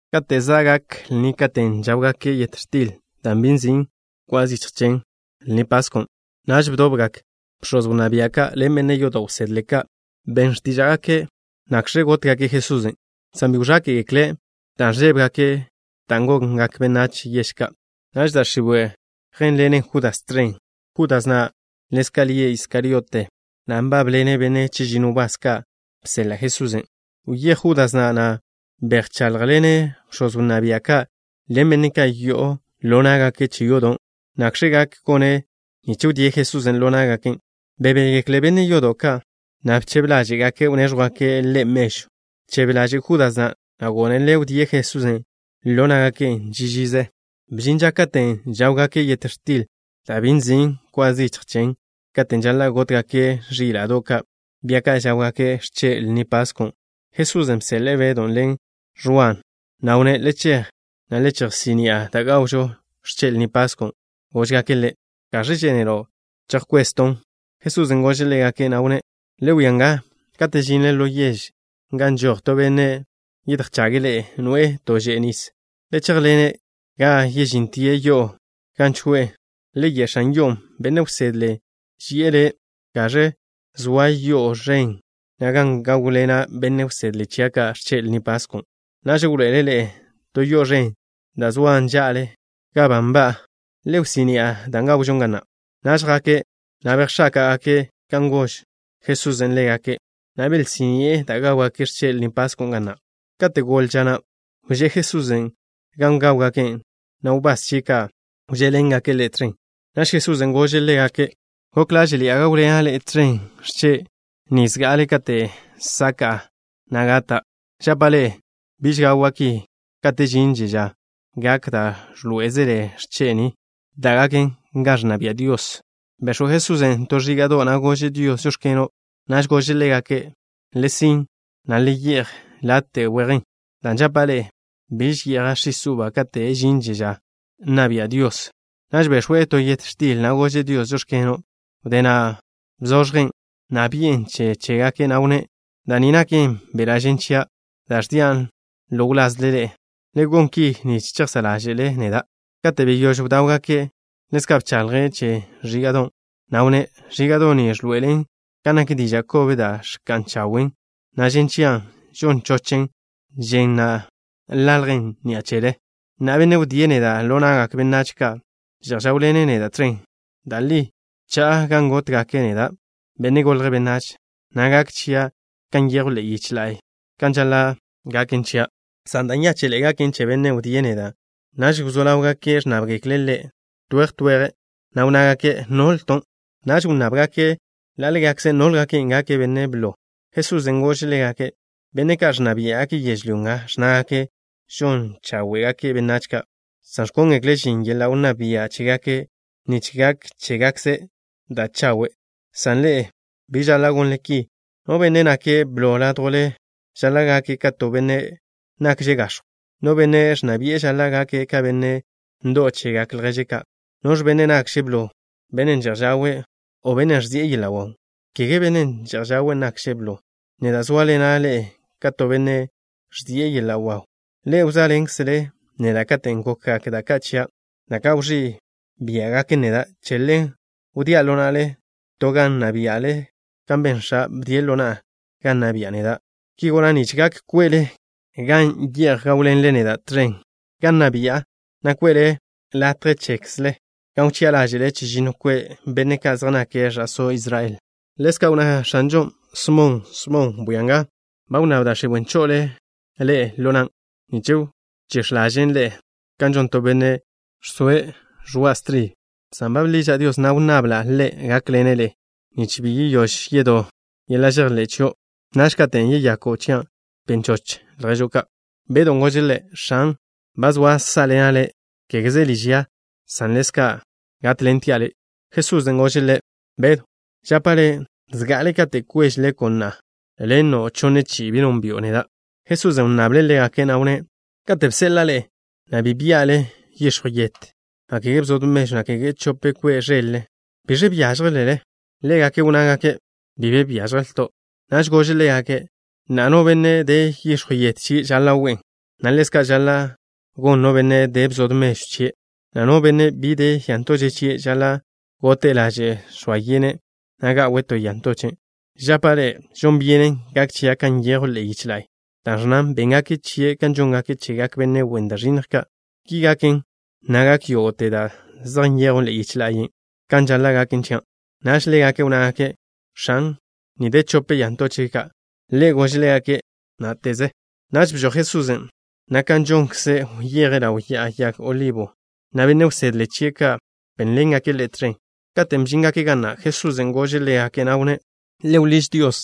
Kate' za' gak lni katen' žáwgake' yet x̱til da' bi nzin' kwa zichj chen, lnin' nzin' Pasko', naž bdobgak bx̱oz wnná bia' ka' ḻen benne' yodo' wsedle ka'. Ben x̱tíža'gake' nakẕe gótgake' Jesusen', san bi wẕáke'gekle', dan' ẕžébegake' da' gongak benách yež ka'. Naž da' x̱iwe' yjénḻenen Judas tẕen. Judas na' ḻezka' lie' Iskariote, na' nbábḻene' benne' chežinno wbás ka' bseḻa' Jesusen', Wyéj Judas na', na' bejcháḻjḻene' bx̱oz wnná bia' ka' ḻen benne' ka' yo'o ḻo ná'gake' che yodo', nakẕe gak gone' nich wdíe' Jesusen' ḻo ná'gake'. Bebégekle benne' yodo' ka', na' bchebe ḻáže'gake' wnéẕjwgake' ḻe' mežw. Bchebe ḻaže' Judas na', na' gónele' wdíe' Jesusen' ḻo ná'gake' ži žize. Bžin ža katen' žáwgake' yet x̱til da' bi nzin' kwa zichj chen, katen' žaḻa' gótgake' ẕíla'do' ka', bia ka' žáwgake' x̱che' Lni Pasko'. Jesusen' bseḻe'e Bedw ḻen Ẕwa, na' wnné': —Le chej, na' le chejsí'ni'a da' gawžo x̱che' Lni Pasko'. Góžgake' ḻe': —¿Gaẕ žénelo' chejkwezton'? Jesusen' gože' ḻégake', na' wnné': —Le wia nga, kate' žinle ḻo yež nga, žoj to benne' yedjchage' ḻe'e, noe'e to že'e nis. Le chéjḻene' ga žíntele yo'o gan choe'e. Le ye' x̱an yo'on': “Benne' wsedle ži'e le': ¿Gaẕe zoa yo'o ẕen na' gan gáwḻena' benne' wsedle chia' ka' x̱che' Lni Pasko'?” Naž wḻoe'ele' ḻe'e to yo'o ẕen da' zoan ža'le gan ba nba'a. Le wsí'ni'a dan' gawžon ga na'. Naž jake', na' bejx̱áka'gake' kan ba gož Jesusen' ḻégake', na' belsí'ni'e da' gáwgake' x̱che' Lni Pasko' ga na'. Kate' goḻe ža na', wžé' Jesusen' gan gáwgake', na' wbás chie' ka' wžé'ḻengake' Ḻe' tẕen. Naž Jesusen' gože' ḻégake': —Gok ḻáže'ḻi'a gáwḻena' ḻe'e tẕen x̱che' ni zga'ale kate' saka'a, na' gata'. Žapa' ḻe'e: biž gawa' ki kate' žinže ža gak da' ẕḻoé'ezele x̱che' ni, da' gaken gan ẕnna bia' Dios. Bex̱w Jesusen' to ẕíga'do', na' gože' Dios: “Žóx̱keno'.” Naž gože' ḻégake': —Le sin', na' le ye'j late' wejen, dan' žapa' ḻe'e: biž ye'ja' x̱is uba kate' žinže ža na' nna bia' Dios. Naž bex̱we' to yet x̱til, na' gože' Dios: “Žóx̱keno'.” Wdé na' bzoẕjen', na' bi'en che chégake', na' wnné': —Da' ni naken beḻa' žen chia' da' ẕdian' ḻo wlazle ḻe'e. Le gon ki nich chejsá' ḻáže'le neda'. Kate' beyóž bdáwgaken', ḻezka' bchaḻje' che ẕíga'don', na' wnné': —Ẕíga'do' ni ẕḻoe'elen kan nak diža' kob da' ẕka'n chawen', na' žen chia' žon chochen, žen na' ḻaljen ni'a chele. ’Na'a, bennen' wdíe' neda' ḻo na'gak benách ka' že'j žáwḻene' neda' tẕen. Da' li cha'a gan gótgake' neda', Benne' Golje' Benách, na' gak chia' kan nyejw ḻe'e yich la'y kan žaḻa' gaken chia', san da' nyáche'ḻe'e gaken che bennen' wdíe' neda'. Naž wzó ḻáwgake' ẕnnábgekle' Ḻe' to weje to weje', na' wnnágake': —¿Nolton'? Naž wnnábgake' ḻa' ḻégakze' nólgake' gake' benne' blo. Jesusen' gože' ḻégake': —Benne' ka' ẕnna biá'gake' yežlyó nga ẕnnágake' žon cháwe'gake' benách ka', san ẕkóngekle' žin yeḻa' wnná bia' chégake' nich gak chégakkze' da' chawe', san ḻe'e bi žaḻa' gonle ki. No benne' nake' blo ládjwle ḻe'e žaḻa' gake' ka to benne' nakže' gax̱jw, na' bennen' ẕnna bi'e žaḻa' gake' ka benne' ndo'w chegak lježe' ka'. ¿Noẕ benne' nakže' blo, bennen' že'j žawe', o bennen' ẕžie' yeḻa' waw? ¿Kege bennen' že'j žawe' nakže' blo? Neda' zóaḻena' ḻe'e ka to benne' ẕžie' yeḻa' waw. ’Ḻe'e wzóaḻenkzele neda' katen' gokgak da' ka' chia', da' ka' wẕí' biá'gaken neda'. Che ḻen wdía' ḻo na'le to gan nna bia'le, kan ben X̱a', bdie' ḻo na'a gan nna bi'a neda'. Ki gona' nich gak kwe'le gan ye'j gáwḻenle neda' tẕen gan nna bi'a, na' kwe'le latje chekzle gan wchi'a ḻáže'le chežinno kwe' benne' ka' zej nake' ẕa'só Israel. Ḻezka' wnná X̱anžon': —Smon, Smon. Bwia nga. Ba wnnáb da' x̱iwe' cho'ole ḻe'e ḻo nan', nich wchíx̱ ḻažen' ḻe'e kan žon to benne' žsoe' ẕoa' stribe, san ba bḻiža' Dios, na' wnnabla' Ḻe' gákḻene' le', nich bi yeyóž yedó yeḻa' žejḻé' chio'. Naž, katen' yeyako' chia', ben choch lježo' ka'. Bedon' gože' Ḻe': —X̱an, ba zoa' sá'ḻena' Le', kégeze liž ya, san ḻezka' ga gátḻentia' Le'. Jesusen' gože' ḻe': —Bedw, žapa' le': zga'ale kate' kweže leko' na'a, le' nno' chonne chi'i bi nónbi'o neda'. Jesusen' wnnable' ḻégake', na' wnné': —Kate' bseḻa'a ḻe'e, na' bi bia'le yix̱jw yet, na' kege bzod mežw, na' kege chope kwe' ẕel-le, ¿biẕe byážjelele? Ḻégake' wnnágake': —Bi be byážjelto'. Naž gože' ḻégake': —Na'a, no benne' de yix̱jw yet chie' žaḻa' we'en, na' ḻezka' žaḻa' gon no benne' de bzod mežw chie', na' no benne' bi de ya ntoche' chie' žaḻa' gote'e laže' žx̱oa yene', na' ga'we' to ya ntoche'. Žapa' ḻe'e: žon byenen gak chia' kan nyejw ḻe'e yich la'y, da' ẕnnan: “Béngake' chie' kan žóngake' chegak benne' wen da' ẕinnj ka'.” Ki gaken, na' gak yógo'te da' zej nyejwn ḻe'e yichen' kan žaḻa' gaken chia'. Naž ḻégake' wnnágake': —X̱an, ni de chope ya ntoche' ka'. Ḻe' gože' ḻégake': —Ná'teze. Naž bžoj Jesusen', na' kan žonkze' wyeje' ḻaw Ya'a Yag Olibo, na' benne' wsedle chie' ka' bénḻengake' Ḻe' tẕen. Katen' bžíngake' ga na', Jesusen' gože' ḻégake', na' wnné': —Le wḻíž Dios,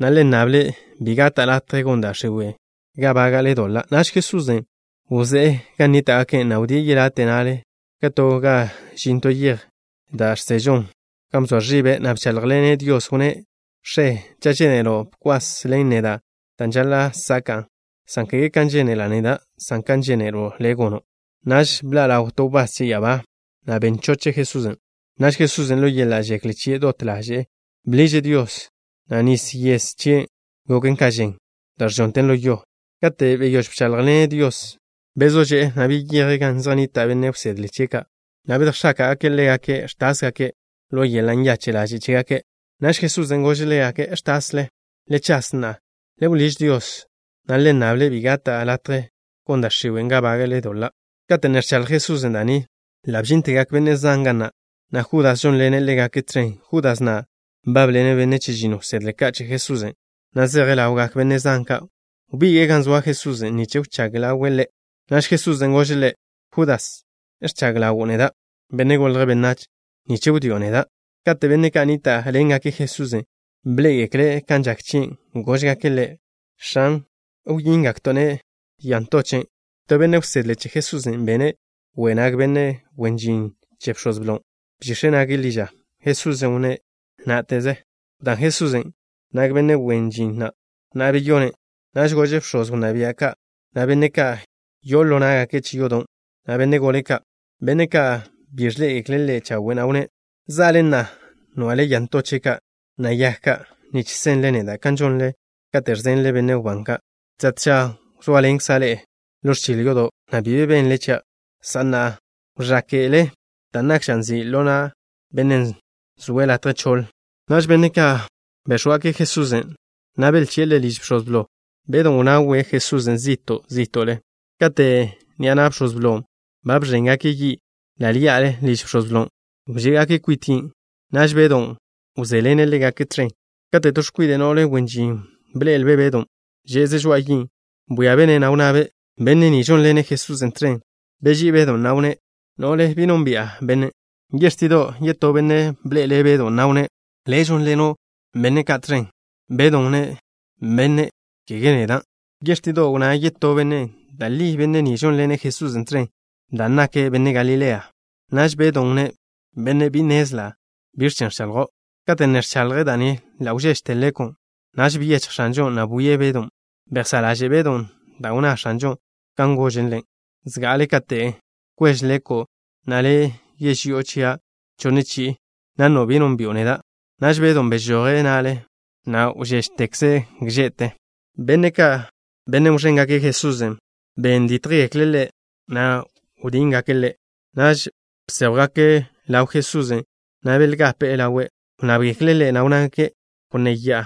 na' le nnable' bi gata' latje gon da' x̱iwe' ga bága'le doḻa'. Naž Jesusen' wzé'e gan nníta'gake', na' wdíe' yelate' na'le ka to ga žin to yej da' žsežon, gan bzoa ẕibe', na' bcháḻjḻene' Dios. Wnné': —X̱e, cha' žénelo', bkwas ḻen neda' dan' žaḻa' saka'a, san kege kan žénela' neda', san ka žénelo' Le' gono'. Naž bḻa' ḻaw to wbás che ya'abá, na' ben choche' Jesusen'. Naž Jesusen', ḻo yeḻa' žekle chie', dot ḻaže'e bḻiže' Dios, na' nis yes chie' goken ka žen, da' ẕžonten ḻo yo. Kate' beyóž bcháḻjḻene' Dios, bezó že'e, na' beyeje' gan zej nnita' benne' wsedle chie' ka', na' bedjx̱ake'e ḻégake' ẕtásgake' ḻo yeḻa' nyache' ḻaže' chégake'. Naž Jesusen' gože' ḻégake': —¿Ẕtasle? Le chas, na' le wḻíž Dios, na' le nnable' bi gata' latje gon da' x̱iwe' ga bága'le doḻa'. Kate' ne ẕchaḻj Jesusen' da' ni, ḻa' bžíntegak benne' zan ga na', na' Judas žónḻene' ḻégake' tẕen. Judas na' nbábḻene' benne' chežinno wsedle ka' che Jesusen', na' zeje' ḻawgak benne' zan ka'. Wbige'e gan zoa Jesusen' nich wchág ḻawe' Ḻe'. Naž Jesusen' gože' ḻe': —Judas, ¿ẕchag ḻawo' neda', Benne' Golje' Benách, nich wdío' neda'? Kate' benne' ka' nníta'ḻengake' Jesusen' bḻé'egekle' kan žak chie', góžgake' Ḻe': —X̱an, ¿wyíngakto'-ne' ya ntoche'? To benne' wsedle che Jesusen' bene' we' nag benne' wen žin che bx̱oz blo. Bžix̱e' nage' ḻi ža. Jesusen' wnné': —Ná'teze. Wdán Jesusen' nag benne' wen žin na', na' beyonen'. Naž gože' bx̱oz wnná bia' ka', na' benne' ka' yo'o ḻo ná'gake' che yodo', na' benne' gole ka', benne' ka' bi ẕḻé'egekle' Ḻe' chawe', na' wnné': —¿Za'le, na' nwa'le ya ntoche' ka', na' yag ka', nich senle neda' kan žonle kate' ẕzenle benne' wbán ka'? Tža tža wzóaḻenkza' ḻe'e ḻo ẕchil yodo', na' bi be benle chia', san na'a wẕáke'le dan' nak ža nzi' ḻo na' bennen' zoe' latje choḻ. Naž benne' ka' béx̱wgake' Jesusen', na' belchi'e Ḻe' liž bx̱oz blo. Bedw wnawe' Jesusen' zi'to' zí'to'le. Kate' ni'a na' bx̱oz blon' ba bẕéngake' yi' ḻa' ḻí'ale liž bx̱oz blon', wžé'gake' kwit yin'. Naž Bedon' wžé'ḻene' ḻégake' tẕen. Kate' to x̱kwide' no'le wen žin bḻe'elbe' Bedon', že'ze' žoa'a yin', bwíabe'-ne', na' wnnabe': —Benne' ni žónḻene' Jesusen' tẕen. Beží'i Bedon', na' wnné': —No'le, bi nónbi'a bennen'. Yextido' yetó benne' bḻe'ele' Bedon', na' wnné': —Le' žónḻeno' benne' ka' tẕen. Bedon' wnné': —Benne', kege neda'. Yextido' wnná yetó benne': —Da' li benne' ni žónḻene' Jesusen' tẕen, dan' nake' benne' Galilea. Naž Bedon' wnné': —Benne', bi nnezla' biẕ chen ẕchaḻjo'. Kate' ne ẕchaḻje' da' ni, ḻa' wžéžete leko'. Naž byechj X̱anžon', na' bwie' Bedon'. Bejsá' ḻaže' Bedon' da' wnná X̱anžon', kan gože' ḻe': “Zga'ale kate' kweže leko' na'a, le' yeži'o chia' chonne chi'i, na' nno' bi nónbi'o neda'.” Naž Bedon' bežoje' na'le, na' wžéžtekze' gže'te. Benne' ka', benne' wẕéngake' Jesusen', ben dítjgekle' Ḻe', na' bdíngake' Ḻe'. Naž bséjwgake' ḻaw Jesusen', na' belgape'e ḻawe'. Wnnábgekle' Ḻe', na' wnnágake': —Wnnéya'a.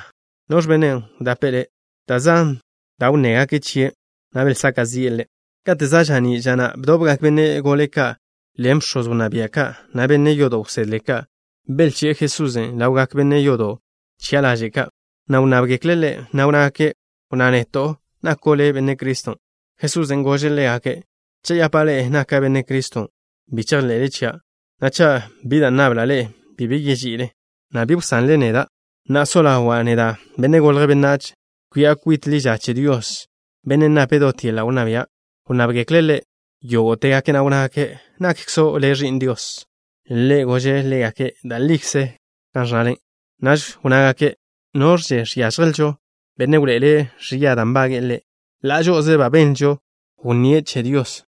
¿Noẕ bennen' wdape'e Le'? Da' zan da' wnnégake' chie', na' belsaka' zi'e Ḻe'. Kate' za' ža'ní' ža na', bdobgak benne' gole ka' ḻen bx̱oz wnná bia' ka', na' benne' yodo' wsedle ka'. Belchi'e Jesusen' ḻawgak benne' yodo' wchi'a ḻaže' ka', na' wnnábgekle' Ḻe', na' wnnágake': —Wnná neto'. ¿Nako' le' Benne' Criston'? Jesusen' gože' ḻégake': —Cha' yapa' ḻe'e naka' Benne' Criston', bi chejḻe'le chia', na' cha' bi da' nnabla' ḻe'e, bi be yeži'ile, na' bi wsanle neda'. Na'a so ḻawa' neda', Benne' Golje' Benách, kwi'a kwit ḻi ža che Dios, Bennen' nape' dot yeḻa' wnná bia'. Wnnábgekle' Ḻe' yógo'tegake', na' wnnágake': —¿Nakkzo' le' Ẕi'n Dios? Ḻe' gože' ḻégake': —Da' likze ẕnnale. Naž wnnágake': —¿Noẕže žiážjelžo benne' wḻoe'ele' ẕia da' nbage'e Ḻe'? Ḻa' žo'oze ba benlžo wnníe' che Dios.